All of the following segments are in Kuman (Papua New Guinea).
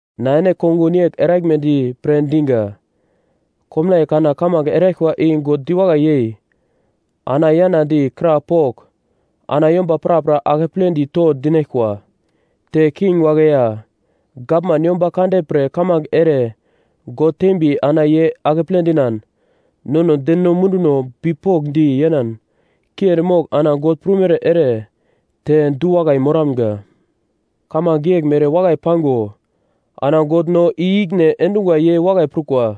Na ene kongun yegl eraglmedi pre diga. Komnaiye kana kamange eraglkwa i God diwakai yei ana yanadi, krapogl, ana yomba prapra akepledi to dinaglkwa. Te king wagle ya gavman yomba kande pre kamange ere God tembi ana ye akeple dinan, nono deno munduno bipokndi yenan kiendi mogl ana God prumere ere te du-wakai moramga. Kamange yeglmere wakai pango ana God no i-ikine endungwa ye wakai prukwa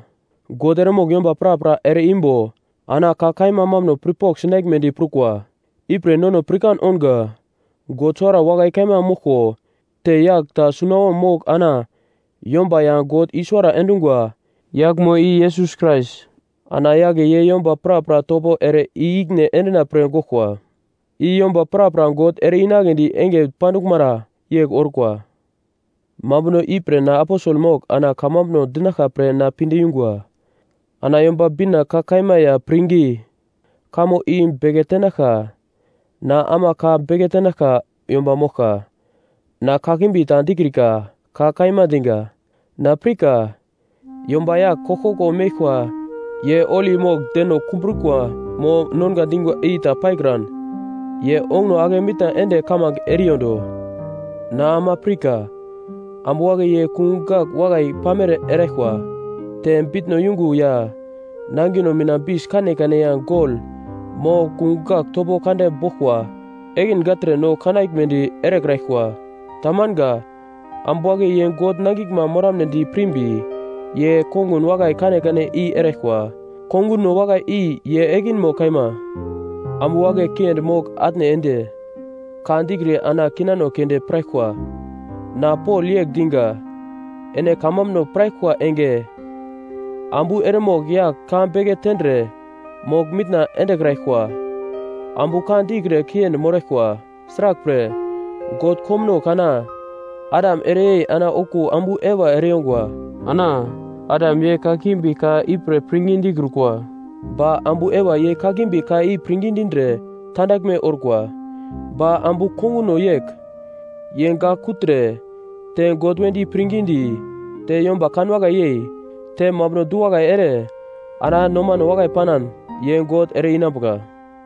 God eremogl yomba prapra ere-imbo ana ka kaima mambuno pirpogl sinaglmedi prukwa. Ipre nono pirkan ounga God suwara kaima moglko te yagl ta sunawom mogl ana yomba ya God i-suwara endungwa, yaglmo i Yesus Krais. Ana yagle ye yomba prapra topo ere i-ikine endina-pre goglkwa, i yomba prapra God ere-inagledi enge panduglmara yegl orkwa. Mambuno ipre na aposel mogl ana kamambuno dinaglka pre na pinde yungwa. Ana Yomba Bina ka kaima ya pirngi kamo i beke tenaglka na ama ka beke tenaglka yomba moglka. Na kimbi ta dikrika, ka kaima diga. Na pirka, yomba yagl koglkoglo meglkwa ye holi mogl deno kumbrikwa mo nonga dingwa i ta paikran, ye onguno ake mitna ende kamange eriyondo. Na ama pirka, ambu wagle ye kungugl gagl wakai pamere eraglkwa, te bitno yungo ya nangino mina bis kanekane ya gol mo kungugl gagl topo kande boglkwa ekin gagltre no kanaglmedi erekraglkwa. Tamanga. Ambu wagle ye God nangiglma moramnedi pirmbi, ye kongun wakai kanekane i eraglkwa. Konguno wakai i ye ekinmo kaima. Ambu wagle kiendi mogl-atne ende, ka dikre ana kinano keunde piraglkwa. Na Pol yegl diga: Ene kamambuno piraglkwa enge ambu eremogl yagl ka beke tendre mogl-mitna endekraglkwa. Ambu ka dikre kiendi moraglkwa. Sraglpre God komuno kana Adam ereyei ana okuwo ambu Eva ereyongwa. Ana, Adam ye kakimbi ka ipre pirngi dikrukwa, ba ambu Eva ye kakimbi ka i pirngi dindre tandaglme orkwa. Ba ambu konguno yegl: Ye gak kugltre, te God wedi pirngidi, te yomba kanwakai yei, te mambuno du-wakai ere, ana nomano wakai panan, ye God ere-inambuka.